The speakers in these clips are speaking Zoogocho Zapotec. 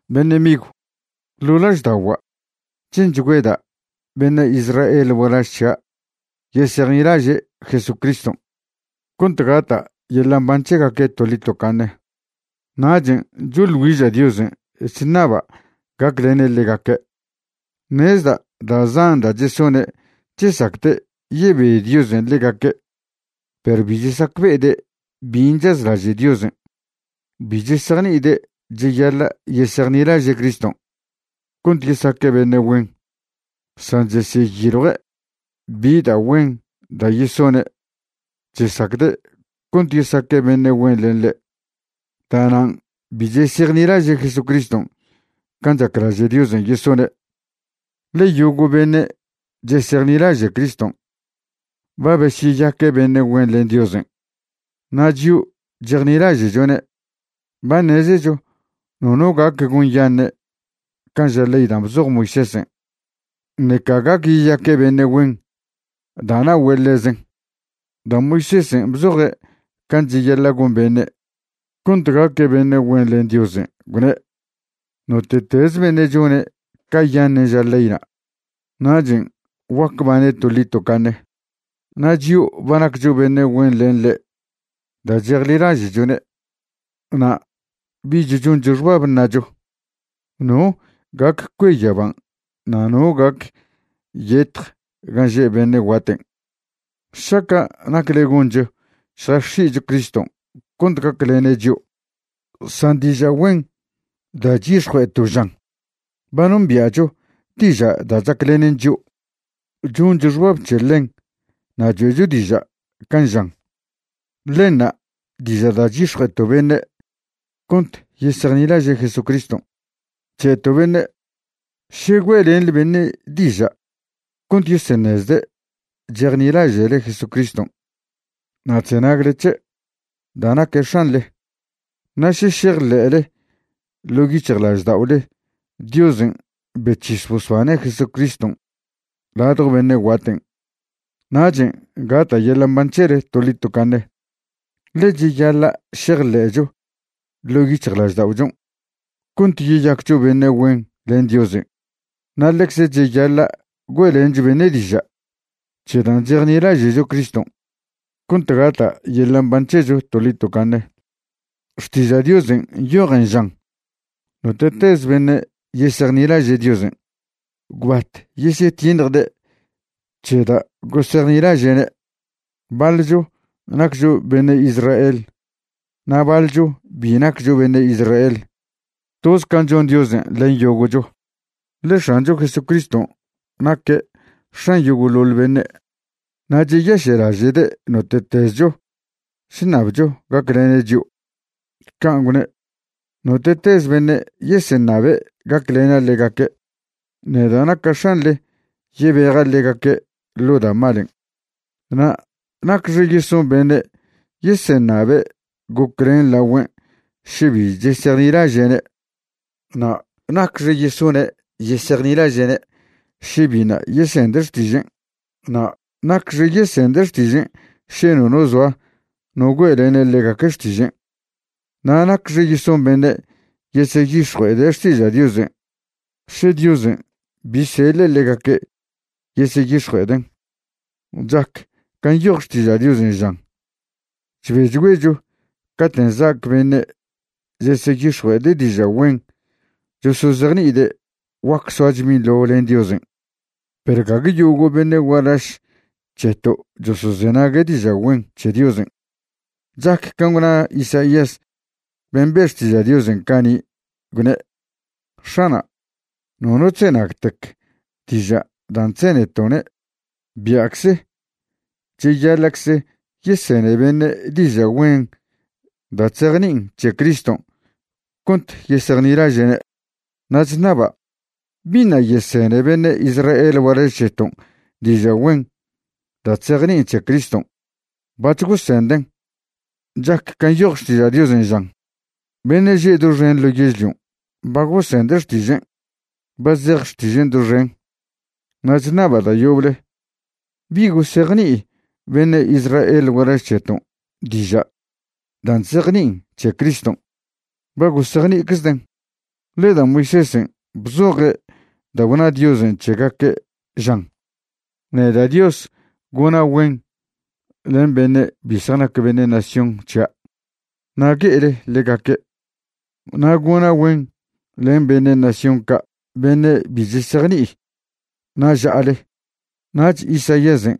Beṉe' migw, ḻo' lažda'ogua' che'nchgüeda' beṉe' Israel gualaž c̱hia' yesejnilaže' Jesucriston' cont gata' yeḻa' mban c̱hegaque' toḻi tocaṉe, nachen' choḻ güiža' Diosen' chṉaba' gaclene' ḻegaque'. Ṉezda' da' zan da' chesone' chesacde' yebe Diosen' ḻegaque', perw bi chesacbe'ede' bin' chazlaže' Diosen'. Bi chesejni'ide' cheyaḻa' yesejnilaže' Criston' cont yesaque' beṉe' güen, san chesyeyiljue' bi da' güen da' yesone' chesacde' cont yesaque' beṉe' güen len ḻe'. Da'nan' bi chesejnilaže' Jesucriston' can' chaclaže' Diosen' yesone'. Ḻe yogo' beṉe' chesejnilaže' Criston' ba besyeyaque' beṉe' güen len Diosen'. Na' chio' chejnilaže'chone' ba ṉezecho nono gac gonyaṉe' can' ža ley dan' bzoj Moisésen', ṉeca gac yeyaque' beṉe' güen da' na'ogüe' ḻezen. Da' Moisésen' bzoje' can' cheyaḻa' gon beṉe' cont gaque' beṉe' güen len Diosen', gwne': “Note'teze beṉe' chone' cayaṉen' ža leyna', nachen' guac bane' toḻi tocaṉe.” Na' chio' ba naccho beṉe' güen len ḻe' da' chejnilaže'chone', na' bich choncho xbab ṉacho: “¿No gac cue yaban' na' no gac yetj gan' že' beṉe' guaten'?” šaca' nacle goncho šjax̱i'cho Criston' cont gaclene' chio'. San diža' güen da' chyix̱jue'eto' žan: “Ba nombia'cho diža' da' chaclenen chio'. Choncho xbab c̱he ḻen na' choe'cho diža' can' žan.” Ḻenṉa' diža' da' chyix̱jue'eto' beṉe' cont yesejnilaže' Jesucriston'. Che'to' beṉe': “Še güe'lenḻe beṉe' diža' cont yeseṉezde' chejnilaže'le Jesucriston' na' chzenagle c̱he' da' naque' X̱anḻe, na' še šejḻe'le ḻo' yic̱hjlažda'ole Diosen' bec̱his bosbane' Jesucriston' ladjo beṉe' guaten', nachen' gata' yeḻa' mban c̱hele toḻi tocaṉe.” Ḻe cheyaḻa' šejḻe'cho ḻo' yic̱hjlažda'ochon' cont yeyaccho beṉe' güen len Diosen' na' ḻecze cheyaḻa' güe'lencho beṉe' diža' c̱he dan' chejnilaže'cho Criston' cont gata' yeḻa' mban c̱hecho toḻi tocaṉe. Xtiža' Diosen' nyojen žan: “Note'tez beṉe' yesejnilaže' Diosen', gwbat yesyetiṉjde' c̱he da' gosejnilaže'ne'.” Baḻcho naccho beṉe' Israel na' baḻcho bi naccho beṉe' Israel, toz can' chon Diosen' len yogo'cho, ḻe X̱ancho Jesucriston' naque' X̱an yogo'ḻoḻ beṉe', na' cheyaše'laže'de' note'tezcho chṉabcho gaclene' chio'. Can' gwne': “Note'tez beṉe' yeseṉabe' gaclena' ḻegaque', neda' naca' X̱anḻe yebeja' ḻegaque' ḻo da' malen'.” Na' ¿nacxe yeson beṉe' yeseṉabe' goclen lagüen' še bi chesejnilaže'ne'? Na' ¿nacxe yesone' yesejnilaže'ne' še biṉa' yesende' xtižen'? Na' ¿nacxe yesende' xtižen' še nono zoa no güe'lene' ḻegaque' xtižen'? na' ¿nacxe yeson beṉe' yeseyix̱jue'ede' xtiža' Diosen' še Diosen' bi seḻe' ḻegaque' yeseyix̱jue'eden'? Chac can' nyoj Xtiža' Diosen' žan: “Chbechgüecho caten' za'ac beṉe' cheseyix̱jue'ede' diža' güen chosozejni'ide' guac soacho binḻo len Diosen'.” Perw gague yogo' beṉe' gualaž c̱heto' chosozenague' diža' güen c̱he Diosen'. Chac can' gwna Isaías ben' be' xtiža' Diosen' cani', gwne': “X̱ana', nono chzenagtec diža' dan' chzeneto'ne'.” Bia'cze cheyaḻa'cze yesene beṉe' diža' güen da' chzejni'in c̱he Criston' cont yesejnilaže'ne'. Na' chṉaba': ¿biṉa' yesene beṉe' Israel gualaž c̱heton' diža' güen da' chzejni'in c̱he Criston'? Bac̱h gosenden'. Chac can' nyoj Xtiža' Diosen' žan: Beṉe' že doxen ḻo yežlion' ba gosende' xtižen'; ba zej xtižen' doxen. Na' chṉaba' da' yoble: ¿bi gosejni'i beṉe' Israel gualaž c̱heton' diža' dan' chzejni'in c̱he Criston'? Ba gosejni'iczden'. Ḻe da' Moisésen' bzoje' da' gwna Diosen' c̱hegaque', žan: Neda' Dios gona' güen len beṉe' bi zjanac beṉe' nación c̱hia', na' gue'ele ḻegaque'. Na' gona' güen len beṉe' nación ca' beṉe' bi chesejni'i, na' ža'ale. Nach Isaíasen'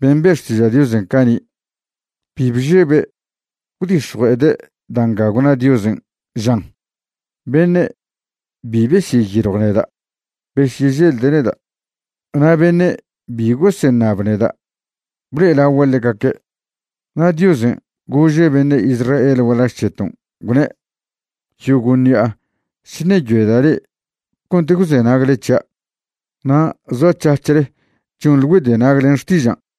ben' be' xtiža' Diosen' cani' bi bžebe' gwdix̱jue'ede' da' nga gwna Diosen', žan: Beṉe' bi besyeyiljw neda', besyeželde' neda'. Na' beṉe' bi goseṉab neda', blo'elagua' ḻegaque'. Na' Diosen' gože' beṉe' Israel gualaž c̱heton', gwne': “Yogo' ṉi'a chṉeyoeda' le'e cont gwzenagle c̱hia', na' zoac̱hac̱hle chonḻe güedenag len xtižan'.”